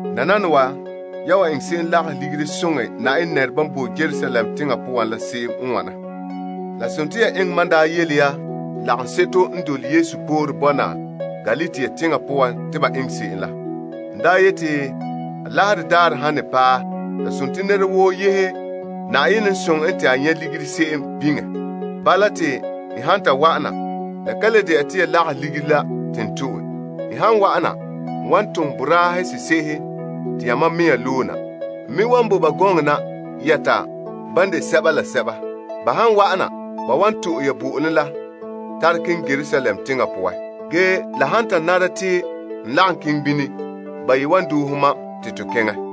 Nananawa, yan wan eŋɛ se'em lagahɛ ligiri soŋɛ Na'ayenɛ nɛresɛba n bo Yerusalem teŋa poan la se'em n wana. La sontii ya eŋɛ mam n daa yele lagaŋseto n dole Yesu sore bɔna Galatia teŋa poan te ba eŋɛ se'em la. N daa yeti, Alaherɛ daarɛ han ne paɛ, la sontii nɛra woo yehe Na'ayenɛ n soŋɛ en te a nyɛ' ligiri se'em biŋe. Bala, te n han ta wa'ana, la ka le de'a te ya lagahɛ ligiri la te n to'e. N han wa'ana, n wan tom boraa sese'ehe te yamam mea loe na. N me wan bo ba gɔŋɔ na yɛta ban de sɛba la sɛba. Ba han wa'ana, ba wan to'e ya bo'olom la tare keŋɛ Yerusalem teŋa poan. Ge la han ta nara te n lagom keŋɛ bini, ba yi wan doohe mam te to keŋɛ.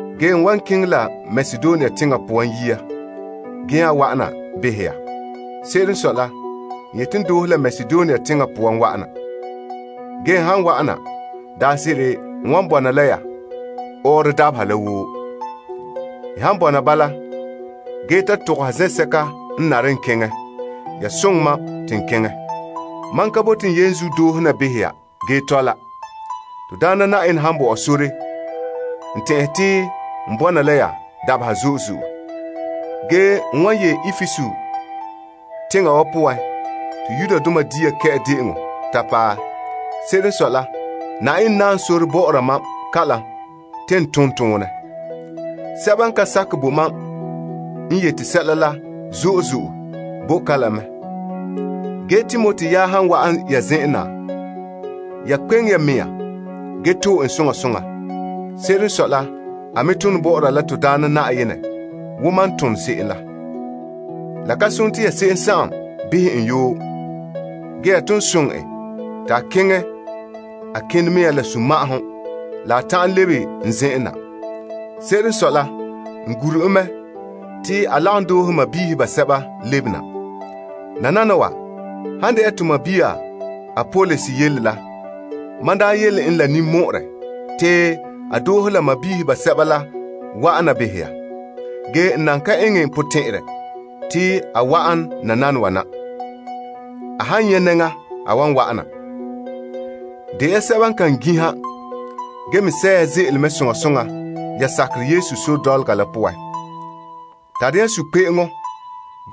Ge n wan keŋɛ la Makedonia teŋa poan yia gee nya wa'ana behɛ ya. Se'ere n sɔe la, n yete n doohe la Makedonia teŋa poan wa'ana. Ge n han wa'ana, daanse'ere n wan bɔna la ya ɔɔrɔ dabeha la woo. N han bɔna bala, gee ta togoha zen'sɛka n nare n keŋɛ, ya soŋɛ mam te n keŋɛ. Mam ka bote n yenzuo doohe na behɛ ya gee tɔla. To Daana Na'ayenɛ han bo ɔ sore, n tɛn'ɛhe te n bɔna la ya dabeha zo'e zo'e. Ge, n wan yee Epesus teŋa wa poan te Dapihinuu Daarɛ ta paɛ. Se'ere n sɔe la, Na'ayenɛ naam sore bɔ'ɔra mam kalam te n tom toonɛ. Sɛba n ka sakɛ bo mam n yete sɛla la zo'e zo'e bo kalam mɛ. Ge Timoti yaɛ han wa'an ya zen'en na, ya kpe'eŋe ya mea gee to'e en soŋa soŋa. Se'ere n sɔe la, a me tone bɔ'ɔra la to Daana Na'ayenɛ wo mam n tone se'em la. La ka sontii ya se'em behɛ en yoo. Ge, ya ton soŋɛ en te a keŋɛ a kinɛ mea la sunma'ahom la a ta'an lebe n zen'en na. Se'ere n sɔe la, n gure en mɛ te a lagom doohe sɔɔnrɔ basɛba lebena. Tɔ. Nananawa, han de'a to sɔɔn Apolos yele la, mam daa yele en la ninmɔ'ɔrɛ te a doohe la sɔɔnrɔ basɛba la wa'an na behɛ ya. Ge a nan ka eŋɛ a potɛn'ɛrɛ te a wa'an nananawa na. A han nyɛ' nɛŋa, a wan wa'ana. De ya sɛba n kan gin'iha, gee me sɛ' ya ze'ele mɛ soŋa soŋa ya sakerɛ Yesu sore dɔlɔga la poan. Tare ya sunkpe'eŋɔ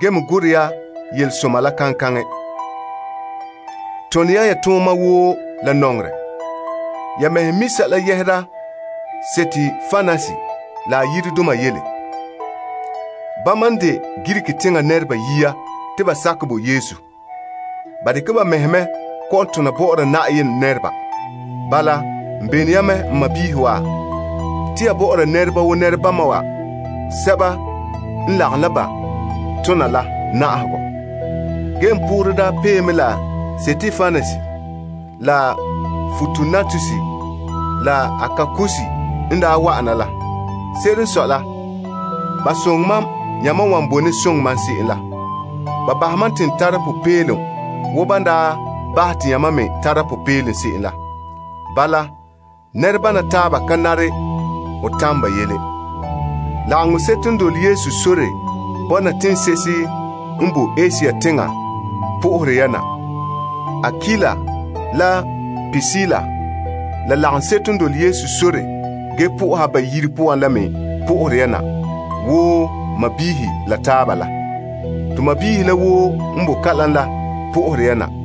gee me gorɛ ya yelesoma la kaŋkaŋɛ. Tone ya ya tooma woo la nɔŋerɛ. Ya mɛhe mi' sɛla yɛhera Stepanas la a yiredoma yele. Bama n de Greek teŋa nɛreba yia te ba sakɛ bo Yesu. Ba dekɛ ba mɛhe mɛ kɔ'ɔn tona bɔ'ɔra Na'ayenɛ nɛreba. Bala, n bene ya mɛ n sɔɔnrɔ wa, te ya bɔ'ɔra nɛreba wo nɛrebama wa sɛba n lagom la ba tona la na'ahegɔ. Ge n poorɛ daa pee mɛ la Stepanas, la Fortunatus, la Akaikus n daa wa'ana la. Se'ere n sɔe la, ba soŋɛ mam yamam wan bone soŋɛ mam se'em la. Ba bahɛ mam te n tare popeelom wo ban daa bahɛ te yamam me tara popeelom se'em la. Bala, nɛrebana taaba ka nare ho tamɛ ba yele. Lagaŋseto n dole Yesu sore bɔna teŋse'ehe n bo Asia teŋa po'ohere ya na. Akuila, la Prisila, la lagaŋseko n dole Yesu sore gee po'oha ba yire poan la me po'ohere ya na wo sɔɔnrɔ la taaba la. To sɔɔnrɔ la woo n bo kalam la po'ohere ya na.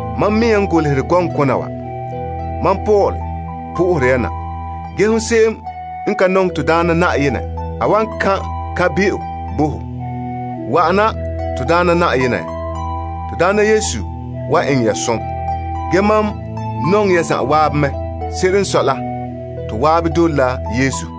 Mam mea n golehɛ kona wa. Mam Paul po'ohere ya na. Ge hon se'em n ka nɔŋɛ to Daana Na'ayenɛ, a wan kan' kan'be'o bo ho. Wa'ana to Daana Na'ayenɛ. To Daana Yesu wan eŋɛ ya som. Ge mam nɔŋɛ ya zanwaabe mɛ. Se'ere n sɔe la, to waabe dole la Yesu.